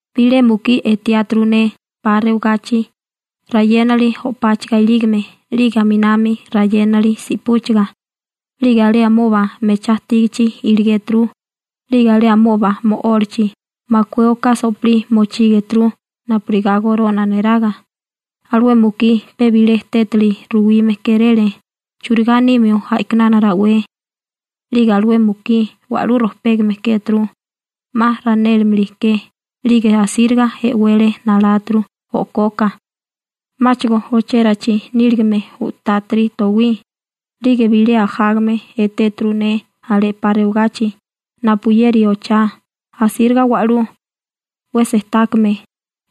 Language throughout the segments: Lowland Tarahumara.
Bilé mukí etiáturu ne 'pa rewagachi rayénali o'páchaga ilígame 'lige aminami rayénali si'púchaga, 'lige alé amoba mechá ajtígichi iligéturu, 'lige alé amoba mo'ólachi makué oká so'pilí mochígeturu napurigá gorona neraga, alué mukí pe bilé tétali ruwime kéréle churigá nimio a'kinana rawé. 'Lige alué mukí wa'lú rojpégame kéturu 'ma ranélimili ke 'lige asíriga e'wele naláturu o'koka, 'máchigo ochérachi níligame u'tátiri towí. 'Lige bilé ajágame etéturu ne alé 'pa rewagachi napuyeri ochá, asíriga wa'lú 'we sejtákame,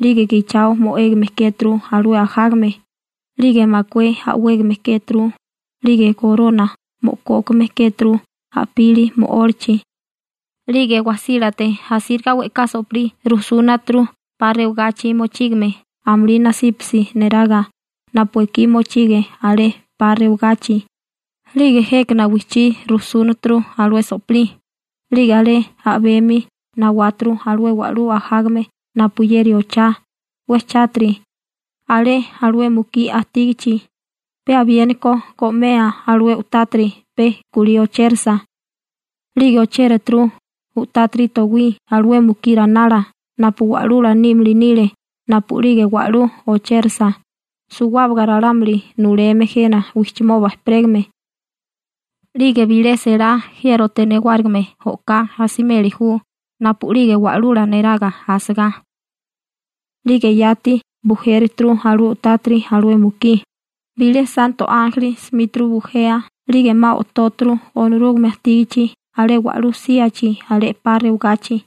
'lige gichao mo'égame kéturu alué ajágame, 'lige makué a'wégame kéturu, 'lige gorona mo'kókame kéturu a'pili mo'ólachi. 'Lige wajsílate asíriga we'ká so'pilí rujsúnaturu 'pa rewagachi mochígame amulí nasípasi neraga napu ekí mochige alé 'pa rewagachi, 'lige jékana wijchí rujsúnaturu alué so'pilí, 'lige alé a'bemi nawáturu alué wa'lú ajágame napuyeri ochá 'we chátiri alé alué mukí ajtígichi, pe abiéniko go'mea alué u'tátiri pe kulí ochérasa. 'Lige ochératuru u'tátiri towí alué mukí ranala napu wa'lula nímili nile napu'lige wa'lú ochérasa, suwábaga ralámuli nuleme jena wijchimoba ejperégame. 'Lige bilé selá jiérote newárigime o'ká asimeli ju napu'lige wa'lula neraga asigá. 'Lige yati bujéruturu alué u'tátiri alué mukí, bilé santo ánjeli simíturu bujea 'lige 'ma o'tóturu Onorúgame ajtígichi alé wa'lú síachi alé 'pa rewagachi.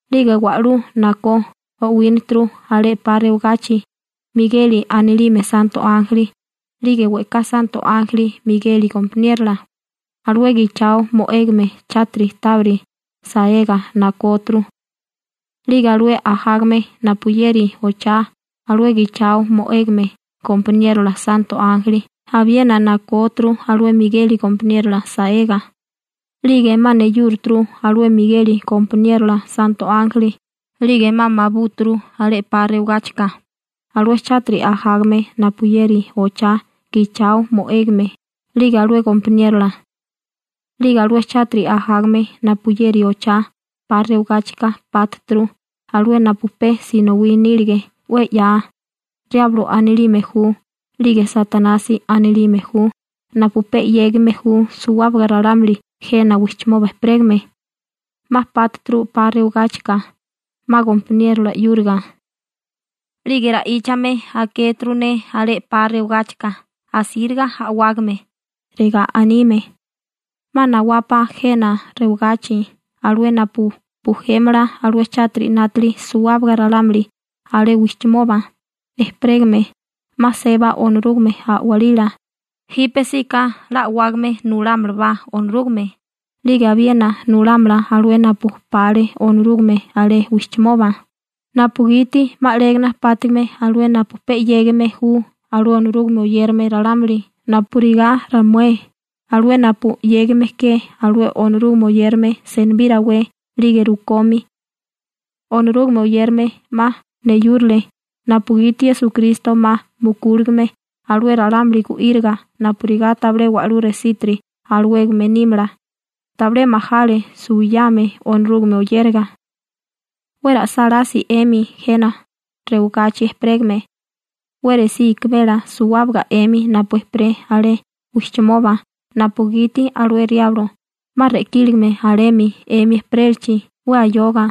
'Lige wa'lú nakó o'winíturu alé 'pa rewagachi. Migeli anilime santo ánjeli, 'lige we'ká santo ánjeli Migeli gompaniérola alué gichao mo'égame chátiri tábiri saega nakóturu. 'Lige alué ajágame napuyeri ochá alué gichao mo'égame gompaniérola santo ánjeli abiena nakóturu alué Migeli gompaniérola saega, 'lige 'ma neyúrituru alué Migeli gompaniérola santo ánjeli 'lige 'ma mabúturu alé 'pa rewagáchika alué chátiri ajágame napuyeri ochá gichao mo'égame 'lige alué gompaniérola. 'Lige alué chátiri ajágame napuyeri ochá 'pa rewigáchika pátuturu alué napu pe sinowí nílige 'we 'ya, Riablo anilime ju 'lige Satanasi anilime ju, napu pe 'yégime ju suwábaga ralámuli jena wijchimoba ejperégame, 'ma pátuturu 'pa rewagáchika, 'ma gompaniérola 'yúriga. 'Lige ra'íchame akéturu ne alé 'pa rewagáchika asíriga a'wágame, regá anime: ―'Ma nawapa jena rewagachi alué napu bujémala alué chátiri 'nátili suwábaga ralámuli alé wijchimoba ejperégame, 'ma seba Onorúgame a'walila, jípesíka 'la a'wágame nulámalabá Onorúgame, 'lige abiena nulámala alué napu pale Onorúgame alé wijchimoba, napugiti 'ma alégana pátigime alué napu pe 'yégime ju alué Onorúgame oyérame ralámuli napurigá ramué, alué napu 'yégime ke alué Onorúgame oyérame senibí rawé 'lige rukomi. Onorúgame oyérame 'ma neyúrile, napugiti Esukristo 'ma mukúligame alué ralámuli gu'íriga napurigá tabilé wa'lú resítiri alawégame nímala, tabilé majale suwiyame Onorúgame oyéraga. 'We ra'sálási 'emi jena rewagachi ejperégame. 'We resí ikimela suwábaga 'emi napu ejperé alé wijchimoba napugiti alué Riablo 'ma re'kíligame alemi 'emi ejperélachi 'we ayoga,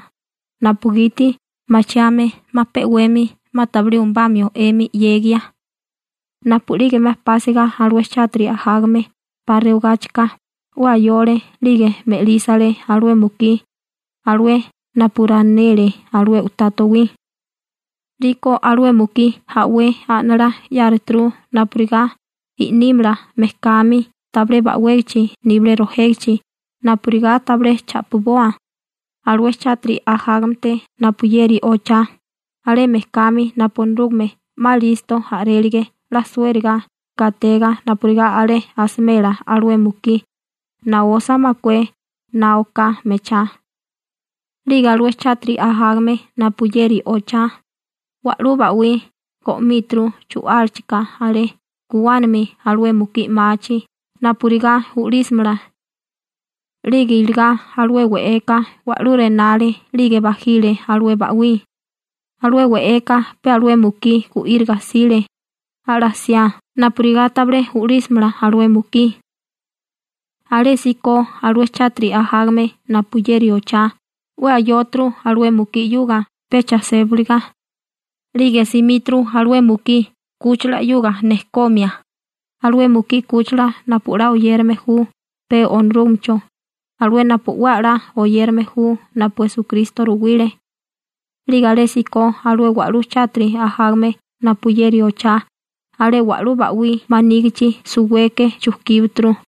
napugiti machiame 'ma pe 'wemi 'ma tabilé umubamio 'emi 'yegia. Napu'lige 'ma pásiga alué chátiri ajágame 'pa rewagáchika 'we ayole 'lige me'lísale alué mukí, alué napu ranele alué u'tá towí. 'Liko alué mukí a'wé a'nalá 'yáruturu napurigá i'nímala mejkami tabilé ba'wégachi nibilé rojégichi napurigá tabilé cha'piboa alué chátiri ajágamete napuyeri ochá, alé mejkami napu Onorúgame 'ma 'la listo a'rélige 'la suériga gatega napurigá alé asimela alué mukí naosa makué na oká mechá. 'Lige alué chátiri ajágame napuyeri ochá wa'lú ba'wí go'míturu chu'álachika alé guwánami alué mukí 'machi napurigá u'lísimala. 'Lige iligá alué we'eka wa'lú re'nale 'lige bajile alué ba'wí. Alué we'eka pe alué mukí gu'íriga 'sile ala'siá napurigá tabilé u'lísimala alué mukí. Alésíko alué chátiri ajágame napuyeri ochá 'we ayóturu alué mukí 'yuga pecha sébaliga, 'lige simíturu alué mukí 'kúchila 'yuga nejkomia, alué mukí 'kúchila napu 'la oyérame ju pe Onorúgamecho, alué napu 'we 'la oyérame ju napu Esukristo ruwile. 'Lige alésíko alué wa'lú chátiri ajágame napuyeri ochá alé wa'lú ba'wí manígichi suweke chujkíbaturu.